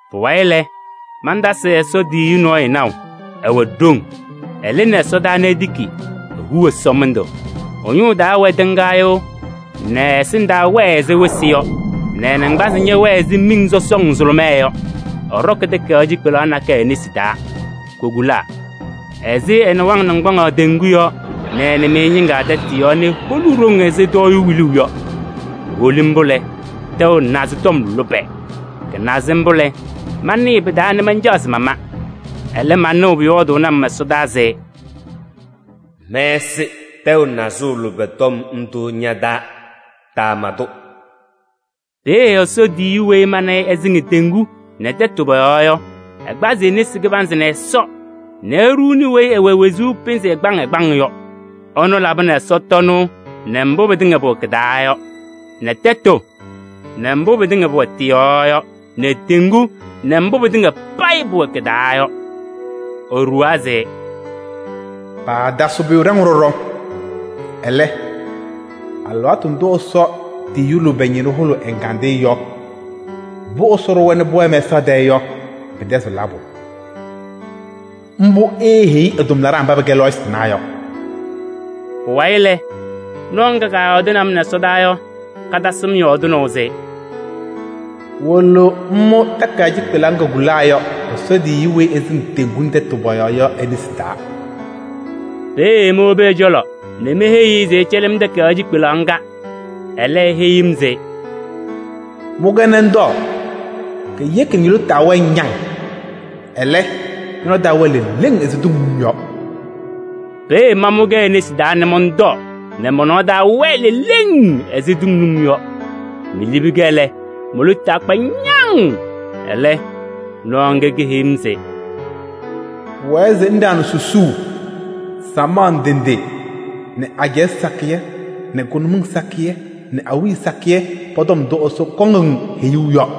Pʋwayɩ lɛ, mantasɩ Ɛsɔ tiyiyu nɔɔyʋ naʋ, ɛwɛ ɖoŋ. Ɛlɩnɩ ɛsɔdaa nɛ etiki, ehu ɛsɔmɩndʋ. Ɛ-ñʋʋ taa wɛ tɩŋgaɣyʋʋ nɛ ɛ-ɛsɩndaa wɛɛ ɛzɩ wɩsɩ yɔ nɛ ɛ-naŋgbanzɩ ñɛwɛɛ ɛzɩ miŋ sɔsɔŋ nzʋlʋmɛɛ yɔ. Ɛɖɔkɩ takayaɣ cikpelaɣ nakɛyɛ e-nesi taa, kokulaa. Ɛsɩ ɛ-nɩwaŋ naŋgbaŋaɣ teŋgu yɔɔ nɛ nɩmɩyɛ ñɩŋga tɛtʋ yɔɔ nɛ eholi ɖoŋ ɛzɩ tɔɔyʋʋ wiluuu yɔ. Eholi mbʋ lɛ, tɛʋ nazɩ tɔm lʋbɛ. Kɩnaza mbʋ lɛ, manɩɩ pɩ-taa nɛ mancaɣ se mama. Ɛlɛ, manɩɣ pʋyɔɔdʋʋnɩ-m nɛ ɛsɔdaa se: “Mɛsɩ tɛʋ nazʋʋ lʋbɛ tɔm ndʋ ña-taa, taama-tʋ.” Peeye Ɛsɔ tiyiyu weyi mana ɛsɩŋ teŋgu nɛ tɛtʋ pɔ-yɔɔ yɔ, ɛkpazɩ e-nesi kɩbanzɩ nɛ Ɛsɔ nɛ eɖuuni weyi ɛwɛ wezuu pɩnzɩ ɛgbaŋ ɛgbaŋ yɔ. Ɛnʋ labɩnɩ ɛsɔtɔnʋʋ nɛ mbʋ pɩtɩŋa pʋwɛ kɩ-taa yɔ nɛ tɛtʋ nɛ mbʋ pɩtɩŋa pʋwɛ tɩ-yɔɔ yɔ nɛ teŋgu nɛ mbʋ pɩtɩŋa pʋwɛ kɩ-taa yɔ. Eɖuwaa se: “Paatasɩɣ pʋyʋ ɖaŋʋʋ ɖɔɖɔ. Ɛlɛ, alɩwaatʋ ndʋ Ɛsɔ tiyiyu lʋbɛ ñɩnʋ hʋlʋʋ ɛ-ɛgandɩyɛ yɔ mbʋ Ɛsɔ ɖʋwa nɛ pʋwɛɛ mɛsaɣ tɛɛ yɔ pɩtɛzɩɣ labʋ. Mbʋ eeheyi ɛ-tʋmlaɖaa mba pɛkɛ lɔɔyɩsɩ tɩnaa yɔ.” Pʋwayɩ lɛ, nɔɔ ŋga kaayɔɔdɩnɩ-m nɛ ɛsɔdaa yɔ, katasɩ-m yɔɔdɩnaʋ se: “Wolo ŋmʋ takayaɣ cikpelaɣ ŋga kokulaa yɔ, Ɛsɔ tiyiyu weyi ɛsɩŋ teŋgu nɛ tɛtʋ pɔ-yɔɔ yɔ e-nesi taa.” Peeye mowobi ɛ-cɔlɔ nɛ meheyi-i se ɛcɛlɩ-m takayaɣ cikpelaɣ ŋga. Ɛlɛ, eheyi-m se: “Mʋ-kɛ nɛ ŋtɔɔ: keyeki nɛ ño-lotu taa wɛɛ ñaŋ. Ɛlɛ, ñɔ-nɔɔ taa wɛɣ leleŋ ɛzɩ tʋŋ num yɔ.” Peeye mamʋ-kɛ e-nesi taa mɔntɔɔ nɛ mɔ-nɔɔ taa wɛɛ leleŋ ɛzɩ tʋŋ num yɔ. Melibi-kɛ lɛ, mo-lotu taa kpa ñaŋ. Ɛlɛ nɔɔ ŋga keheyi-m se: “Pʋwɛɛ se ŋɖaɣnɩ susuu samaɣ ndɩ ndɩ nɛ ajɛɛ sakɩyɛ nɛ kʋnʋmɩŋ sakɩyɛ nɛ awiya sakɩyɛ pɔ-tɔm ndʋ Ɛsɔ kɔŋ-ŋ heyuu yɔ.”